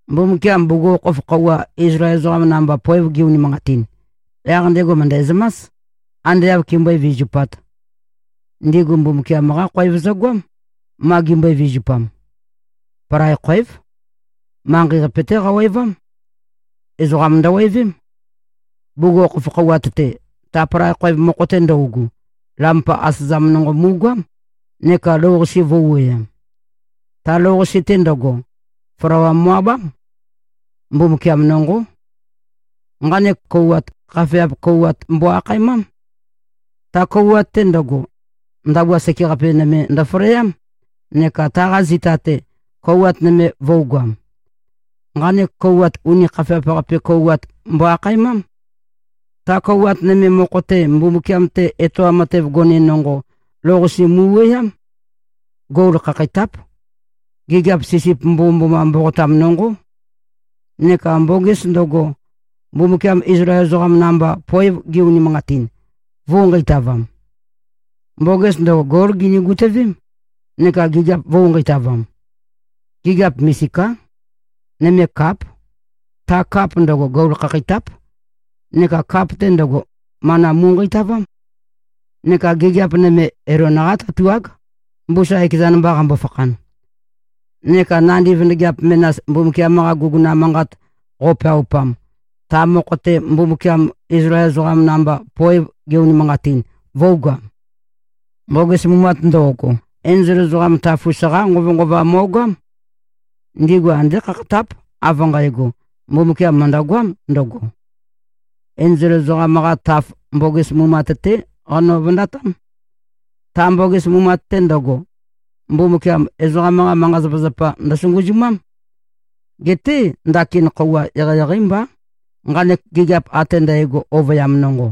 Mbumbukiam bugukhokhof khøuwa, Izlael ezoqam namba poev ge-unimanqatin, yaq ndego mø̀ndæzømás, ande āv kimbøé-vizupāt. Ndigu Mbumbukiam-qá khoev zøgoám, ma gimbøe-vizupam. Palai khoév. Manqei-qape-té qawevám. Ezoqa ndøwevém. Bugukhokhof kouwat-te, ta palai khoev mokho-te ndøugu, lampa asøzam nonqo mu꞉goám neka lou-qase vø̄u-wuøyam. Ta lou-qase-te ndøgo, flawa mo꞉-abám. Mbumbukiam nonqó. Nqanek kouwat, khafeap kouwat mbo-akhaemám. Ta kouwat-te ndøgo, ndabua sekeqape nøme ndøfaleám, neka taqa zita-te, kouwat nøme vø̄ugoam. Nqanek kouwat, uni khafeap-qape kouwat mbo-akhaemám. Ta kouwat nøme mokho-te, Mbumbukiam-te etoam matev gone nonqo lou-qase mu꞉wuøyám. Gol khakheitáp. Gigiap sisip mbomømboma mboqotam nonqó. Neka mboges ndøgo, Mbumbukiam Izlael ezoqam namba, poev ge-unimanqatin, vø̄u-nqeitavam. Mboges ndøgo, gól gini-gutøvém, neka gigiap vø̄u-nqeitavam. Gigiap misiká: Nøme káp. Ta kap ndøgo, gol khakheitáp. Neka kap-te ndøgo, mana mu꞉nqeitavám. Neka gigiap nøme, Elon-qá tatuág, mbusa ekezan mba qambo-fakhan. Neka nandi vøndøgeap menas, Mbumbukiam-qa guguna manqat qo꞉peaupam, ta mokho-te Mbumbukiam Izlael ezoqam namba poev ge-unimanqatin, vø̄ugoam. Mboges mumat ndo꞉go, enzol ezoqam taf-us-qá nqovønqova mo꞉goám. Ndigu andé khakhatáp, av nqægo, Mbumbukiam mø̀ndøgoám ndøgo. Enzol ezoqam-qa taf, mboges mumat-té qano-vøndatám. Ta mboges mumat-te ndøgo, Mbumbukiam ezoqam-qa manqa-zapazapa ndøsunguzumám. Geté, ndakin khøuwa eqeieqeí mbá, nqanek gigiap ate ndægo ovøyam nonqo.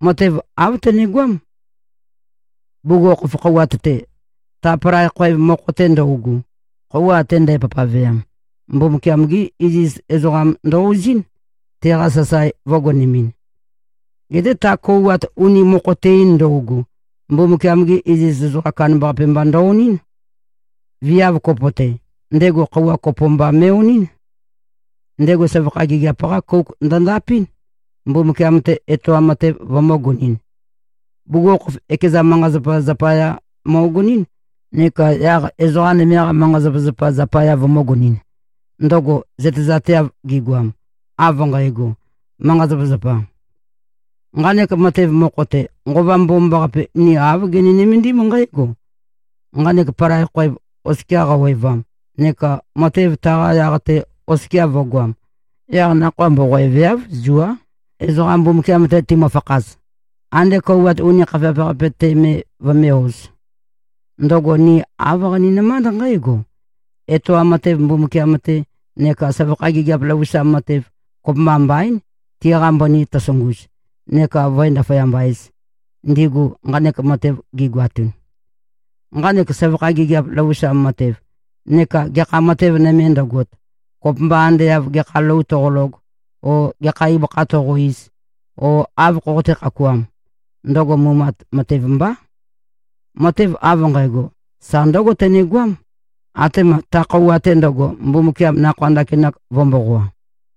Matev āv tønegoám. Bugukhokhof kouwat-te, ta palai khoev mokho-te ndøugu, khøuwa ate ndæpavpaveam, Mbumbukiam-gí iziz ezoqam ndø-ozín, teqa sasae vø̄gonemɨn. Geté ta kouwat uni mokho-te-in ndøugu, Mbumbukiam-ge iziz ezoqam kandambaqape mba ndø-onɨ́n. Viav kopo-te, ndego khøuwa kopo mba me꞉-onɨ́n. Ndego søvakha gigiap-qá kouk ndøndapɨ́n, Mbumbukiam-te etoam matev vømø̄gonɨn. Bugukhokhof, ekeza manqa-zapazapa zapaya møgonɨ́n neka yaq ezoqa nøme-qa manqa-zapazapa zapaya vømø̄gonɨn, ndøgo zøtezateav gigoam, av nqægo, manqa-zapazapā. Nqanek matev mokho-te, Nqova Mbomambaqape, ni āv gini-nømendím nqǽgo: Nqanek palai khoev oskia qawevam neka matev taqa yaq-te oskia vø̄goam, yaq nakhoa mboqoeveáv, zuá, ezoqam Mbumbukiam-te timøfakhaz, ande kouwat uni khafeap-qape-te me vømé-ōz. Ndøgo ni āv qaninømánd nqǽgo: Etoam matev Mbumbukiam-te, neka søvakha gigiap løvusam matev, kopømba mbaín, tiqa mbøni tøsunguz, neka vǿe-ndaføyamba-ēz, ndigu nqanek matev gigoatun. Nqanek søvakha gigiap løvusam matev neka gekha matev nøme ndøgot, kopømba ande av gekha lou toqolog o gekha ibøkha toqo-iz o āv khoqoté-khakuām, ndøgo mumat matev mbá. Matev av nqægo, sa ndǿgo tønegoám, atema ta khøuwa-te ndøgo, Mbumbukiam nakhoa ndakinak vø̄-mboqoa.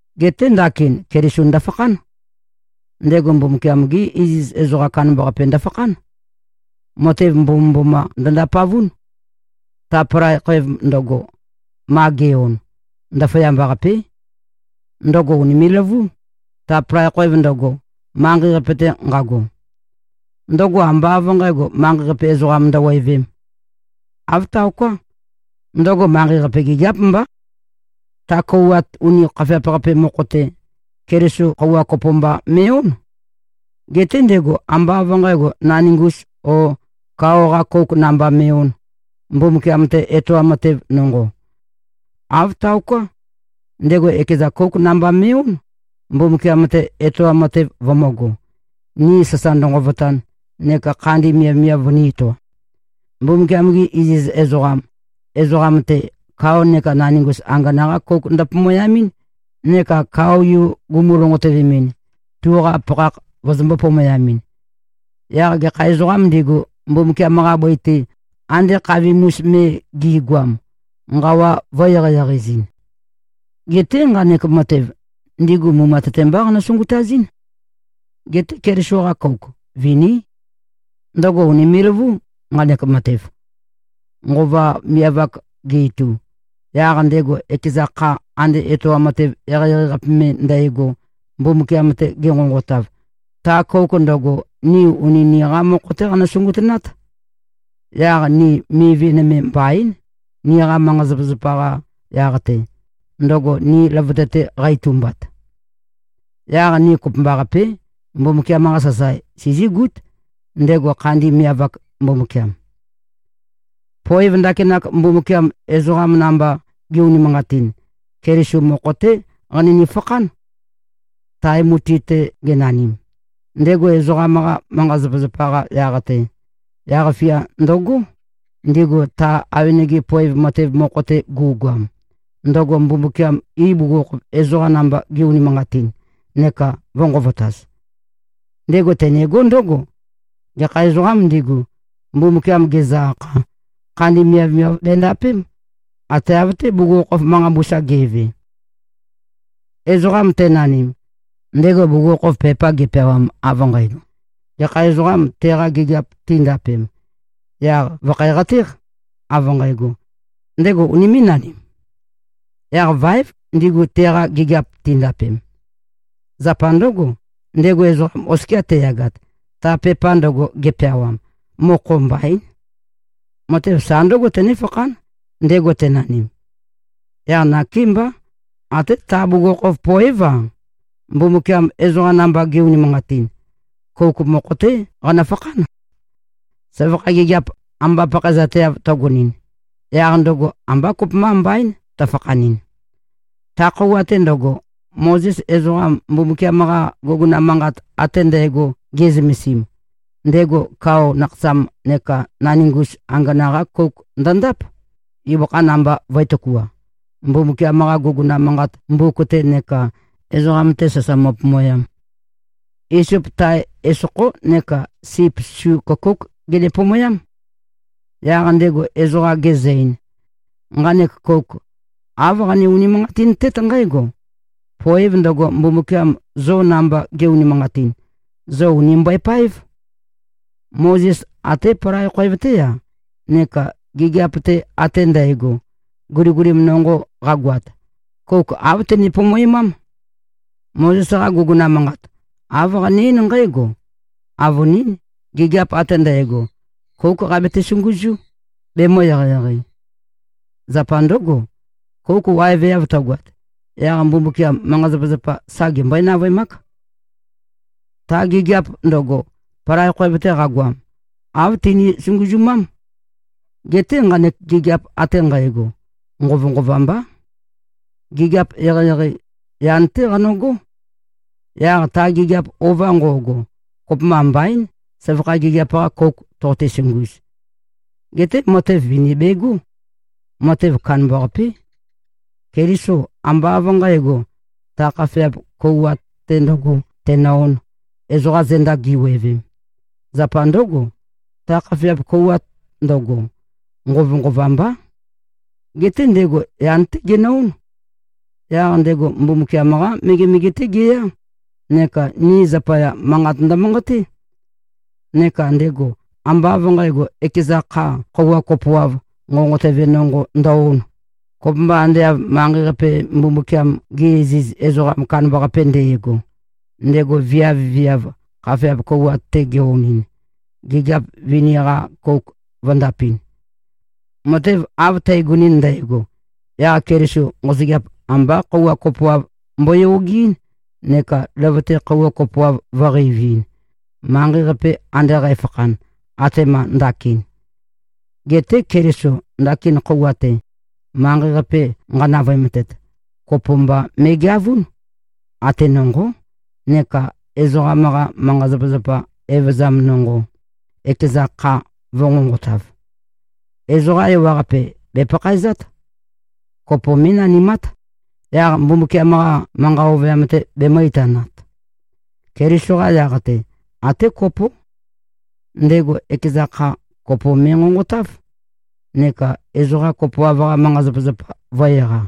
Geté ndakin Keliso ndøfakhán. Ndego Mbumbukiam-gé iziz ezoqa kandambaqape ndøfakhán. Matev mbomømboma ndø-ndapavún. Ta palai khoev ndøgo, ma ge꞉-on, ndaføyamba-qapé. Ndøgo ùnime꞉-løvú, ta palai khoev ndøgo, manqei-qape-te nqago. Ndøgo ambá av nqǣgo, manqei-qape ezoqa ndøwevēm. Āv taoká. Ndøgo manqei-qape gigiáp mbá. Ta kouwat uni khafeap-qape mokho-te, Keliso khøuwa kopo mba me꞉-ón. Geté ndego ambá av nqǣgo, naningus o kao-qā kōuk namba me꞉-ōn, Mbumbukiam-te etoam matev nonqo. Āv taoká. Ndego ekeza kóuk namba me꞉-ón, Mbumbukiam-te etoam matev vømø̄go, ni sasa ndønqovotan neka khandi miavmiav vønī-etoam. Mbumbukiam-gi iziz ezoqam, ezoqam-te, kao neka naningus angana-qá kouk ndøpomoyamɨ́n, neka kao-yu gumu-lonqotøvemɨn, tuqa pakhakh vøzømbō-pomoyamɨn. Yaq gekha ezoqām ndigu, Mbumbukiam-qa bøi-te, ande khavim-us me gi꞉goam, nqawa vø̄-eqeieqei-ezɨn. Geté nqanek matev, ndigu mumat-te mbá qanø-sungutazɨ́n. Geté Keliso-qa kouk viní. Ndøgo ùnime꞉-løvú, nqanek matev. Nqova miav-ak ge-itu, yaq ndego ekeza kha ande etoam matev eqeieqei-qape me ndægo, Mbumbukiam-te genqonqotav, ta kouk ndøgo, ni uni niqa mokho-té qanø-sungutønát. Yaq ni mivi nøme mbaín, niqa manqa-zapazapa-qa yaq-te, ndøgo ni løvøte-te qa-itumbat. Yaq ni kopømbaqapé, Mbumbukiam-qa sasae sizígút, ndego khandi miav-ak Mbumbukiam. Poev ndakinak, Mbumbukiam ezoqa namba ge꞉-unimanqatin, Keliso mokho-té qanøni-fakhán. Tae mutui-te genanim, ndego ezoqam-qa manqa-zapazapa-qa yaq-te, yaq-fia ndøgó, ndigu ta awenege poev matev mokho-te gu꞉goam, ndøgo Mbumbukiam ibugukhokhof ezoqam namba ge꞉-unimanqatin, neka vø̄nqovotaz. Ndego tenegó ndǿgo: Gekha ezoqām ndigu, Mbumbukiam gezø-akha, khandi miavmiav bendapém, ate av-té, bugukhokhof manqa mbusa ge꞉ve. Ezoqa tenanim, ndego bugukhokhof pepa gepeawam av nqægo, gekha ezoqam teqa gigiap tindapem, yaq vø̀khæqatéq, av nqægo: Ndego unimé꞉-nanim? Yaq váev, ndigu teqa gigiap tindapem. Zapa ndǿgo, ndego ezoqam oskia teyagat, ta pepa ndøgo gepeawam, mokho mbaín. Matev sa ndǿgo, tønéfakhán, ndego tenanim. Yaq nakémbá, até ta bugukhokhof poév-a, Mbumbukiam ezoqa namba ge꞉-unimanqatin, kouk mokho-té qanøfakhán. Søvakha gigiap amba pakhaezateav tøgonɨn, yaq ndøgo ambá kopømba mbaín, tøfakhanɨn. Ta khøuwa-te ndøgo, Mozes ezoqa Mbumbukiam-qa guguna manqat ate ndægo ge꞉zømesim, ndego kao nakhasam neka naningus angana-qá kouk ndøndáp, ibøkha namba vø̄e-tøkua, Mbumbukiam-qa guguna manqat mbuk-te neka ezoqam-te sasa mo꞉pomoyam. Isop tae esokhó neka sip su køkóuk genepomoyám. Yaq ndego ezoqa gezø-ein, “Nqanek kouk, āv qane-unimanqatintét nqǽgo: Poev ndøgo, Mbumbukiam zo namba ge꞉-unimanqatin, zo ùni mbøepáev.” Mozes até palai khoev-té-a neka gigiap-te ate ndægo, guligulim nonqo qagoat, kouk āv tene-pomoemám. Mozes-qa guguna manqat, āv qane-eín nqǽgo: Avønín, gigiap ate ndægo, kóuk qabete-sunguzú, bemø̄-eqeieqei. Zapa ndǿgo, kouk waeveav tøgoat, yaq Mbumbukiam manqa-zapazapa sa gembøé-navøemák. Ta gigiap ndøgo, palai khoev-te qagoam, āv tini-sunguzumám. Geté nqanek gigiap ate nqægo, nqovønqova mbá. Gigiap eqeieqei, yan-té qano꞉gó. Yaq ta gigiap ova nqo꞉go, kopømba mbaín, søvakha gigiap-qa kouk toqote-sunguz. Geté matev vini begó. Matev kandambaqapé. Keliso ambá av nqǣgo, ta khafeap kouwat-te ndø̄go tenø-ōn, ezoqa zenda gi꞉wevem. Zapa ndǿgo, ta khafeap kouwat ndøgo, nqovønqova mbá. Geté ndego yan-té genø-ón. Yaq ndego Mbumbukiam-qá megemege-té geyá, neka ni zapaya, manqat ndømanqaté. Neka ndego ambá av nqǣgo, ekeza kha khøuwa kopoav nqonqotøve nonqo ndø-ón, kopømba ande av manqei-qape Mbumbukiam-ge iziz ezoqam kandambaqape nde꞉go, ndego viav-viav khafeap kouwat-te ge-onɨn, gigiap vini-qa kouk vø̄ndapɨn. Matev av tægonɨn ndægo, yaq Keliso nqosøgeap ambá khøuwa kopoav mboyogeɨ́n, neka løvøte khøuwa kopoav vø̄qeiviin, manqei-qape ande qæfakhan, atema ndakin. Geté Keliso ndakin khøuwa-te, manqei-qape nqanavøemtet, kopo mba me꞉geavún, ate nonqó, neka ezoqam-qa manqa-zapazapa evøzam nonqo, ekeza kha vø̄nqonqotav. Ezoqa ewaqape, bèpakhaezát. Kopo mé꞉nanimát, yaq Mbumbukiam-qa manqa ovøyam-te bemø̄-itanat. Keliso-qa yaq-te, até kopó: Ndego ekeza kha, kopo me꞉nqonqotáv, neka ezoqa kopoav-qa manqa-zapazapa vø̄-eqa.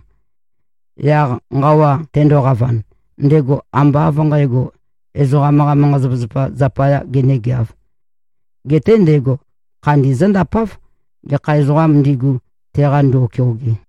Yaq nqawa tendoqavan, ndego ambá av nqǣgo, ezoqam-qa manqa-zapazapa zapayā genēgeāv. Geté ndego khandi zǿndapáv, gekha ezoqām ndigu, teqa ndo꞉keoge.